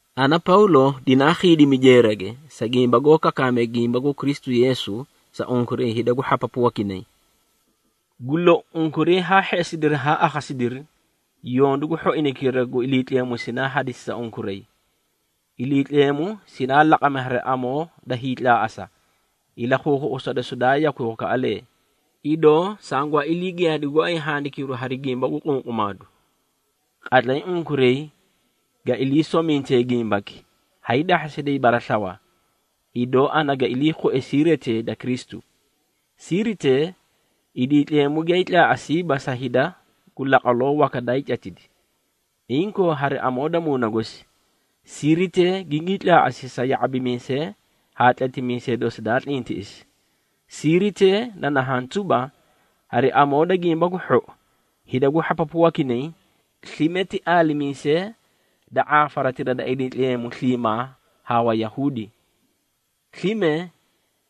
Ana Pawlo dinaa khiidimi jeerage, sa gimba goó kakaamee gimba gu Kristu Yeesu, sa unkuray hida gu hhapapu wakinay. Gu lou, unkuray haa hheꞌesidiri haa akhasidiri, yondu gu hhoinaykira gu Iliitleemu sinaa hadisi sa unkuray. Iliitleemu sinaa laqami hari amoo da hiitlaaꞌasa, ilakhuukhuꞌusa dosi daa yakwi wakaꞌalee, idoo sangwaa ilii giyaadi gooay handikiru hari gimba gu qunqumaadu. Qatlay unkuray ga ilii somintee gimbaki, haay dahhasiday baraslawa, idoo ana ga iliikhue siiritee da Kristu. Siiritee, Iliitleemu giyaay tlaaꞌasiiba sa hida gu laqwaloo waka daay catidi. Inkoo hari amoo da Muuna gosi, siiritee gingii tlaaꞌasi sa ya⁄abimiisee haa tletimiisee dosi daa tlintiꞌisi. Siiritee na nahaã tuba, hari amoo da Gimba gu Hhou, hida gu hhapapu wakinay, slime ti aalimiisee da ⁄aafaratira da Iliitleemu sliimaa haa Wayahuudi. Slime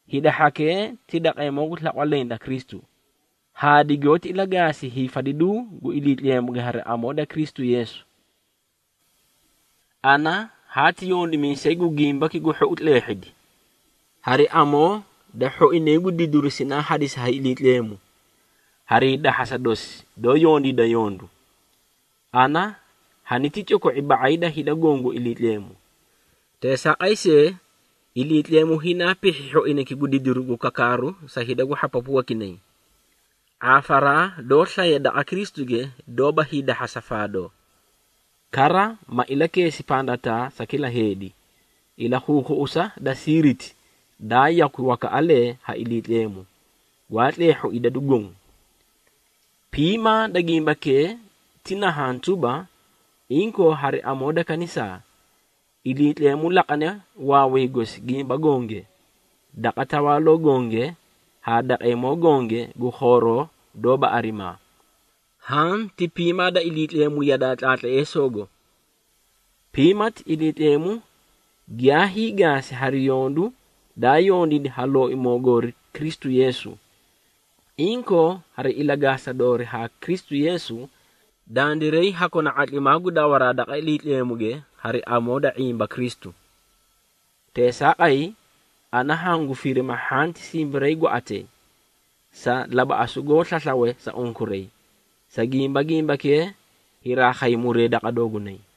hida hhakee ti daqeemoo gu slaqwa leẽ da Kristu, haa digoóti ilagaasi hiifadiduu gu Iliitleemuge hari amoo da Kristu Yeesu. Ana haati yondimiisay gu Gimbaki gu Hhou tleehhidi, hari amoo da hhoinay gu didiru sinaa hadisi ha Iliitleemu harii dahhasa dosi doó yondiida yondu. Ana haniti coko⁄i ba⁄ay da hida goõ gu Iliitleemu. Teesaaqay see, Iliitleemu hinaa pihhi hhoinayki gu didiru gu kakaaru sa hida gu hhapapu wakinay, ⁄aafaraa doó slaye daqa Kristuge doóba hiidahhasa faadoo. Kara ma ilakeesi pandataa sa kila heedi, ilakhuukhuꞌusa da siiriti daa yakwi wakaꞌalee ha Iliitleemu, gwaa tleehhu idadu goõ. Piimaa da gimbakee ti nahaã tuba, inkoo hari amoo da kanisaa, Iliitleemu laqane waaway gosi gimba gonge, daqa tawaaloo gonge haa daqeemoo gonge gu khooroo doóba arimaa. Haã ti piimaa da Iliitleemu yadaa tlaatleesoogo. Piimati Iliitleemu giyaa hiigaasi hari yondu daa yondiidi ha Looimoo goori Kristu Yeesu. Inkoo, hari ilagaasa doorii haa Kristu Yeesu, dandiray ha kona ⁄atlimaa gu dawaraa daqa Iliitleemuge hari amoo da ⁄imba Kristu. Teesaaqay, ana hangu firima hhanti simbarii gwaꞌatay, sa labaꞌasu goó slaslawe sa unkuray, sa gimba, gimbakee hiraa khay muree daqa doogunay.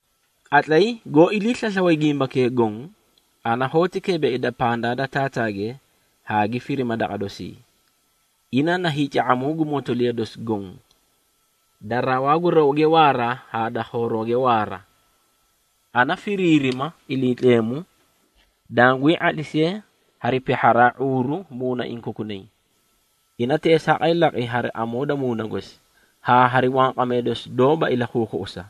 Qatlay goó ilii slaslawe gimbakee goõ, ana hoóti keebeeida pandaa da Taataage, haa gi firima daqa dosii. Ina na hiica⁄amuu gu motoliya dosi goõ da rawaa gu rawge waara haa da khoorooge waara. Ana firiirima Iliitleemu, dangwii ⁄atlisiye hari pihharaa ⁄uuru muunaiĩ kokunay. Ina teesaaqay laqi hari amoo da Muuna gosi, haa hari wanqamee dosi doóba ilakhuukhuꞌusa.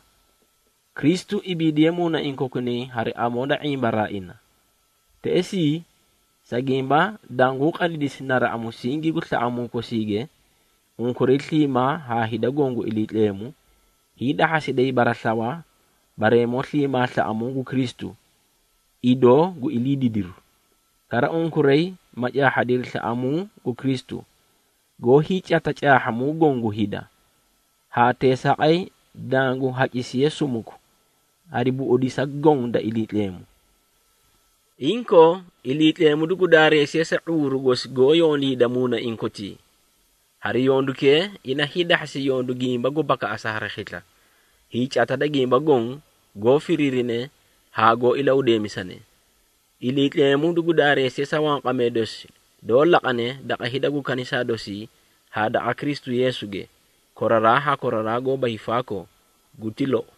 Kristu ibiidiye muunaiĩ kokunay hari amoo da ⁄imbaraa ina. Teꞌesii, sa gimba danguũ qadidisi naraꞌa musingi gu slaꞌamuu kosiige, unkuray sliimaa haa hida goõ gu Iliitleemu, hiidahhasiday baraslawa bareemoo sliimaa slaꞌamuu gu Kristu, idoo gu ilii didiru. Kara unkuray ma caahhadiri slaꞌamuu gu Kristu, goó hiicata caahhamuu goõ gu hida, haa teesaaqay dangu hacisiye sumuku hari buꞌudisa goõ da Iliitleemu. Inkoo, Iliitleemu dugu daareesiye sa ⁄uuru gosi goó yondiida muunaiĩ kotii. Hari yondukee, ina hiidahhasi yondu gimba gu bakaꞌasa hari khisla, hiicata da gimba goõ, goó firiirine haa goó ilahudeemisane. Iliitleemu dugu daareesiye sa wanqamee dosi doó laqane daqa hida gu kanisaa dosii haa daqa Kristu Yeesuge, koraraa haa koraraa goóba hiifaakoo. Guti lou.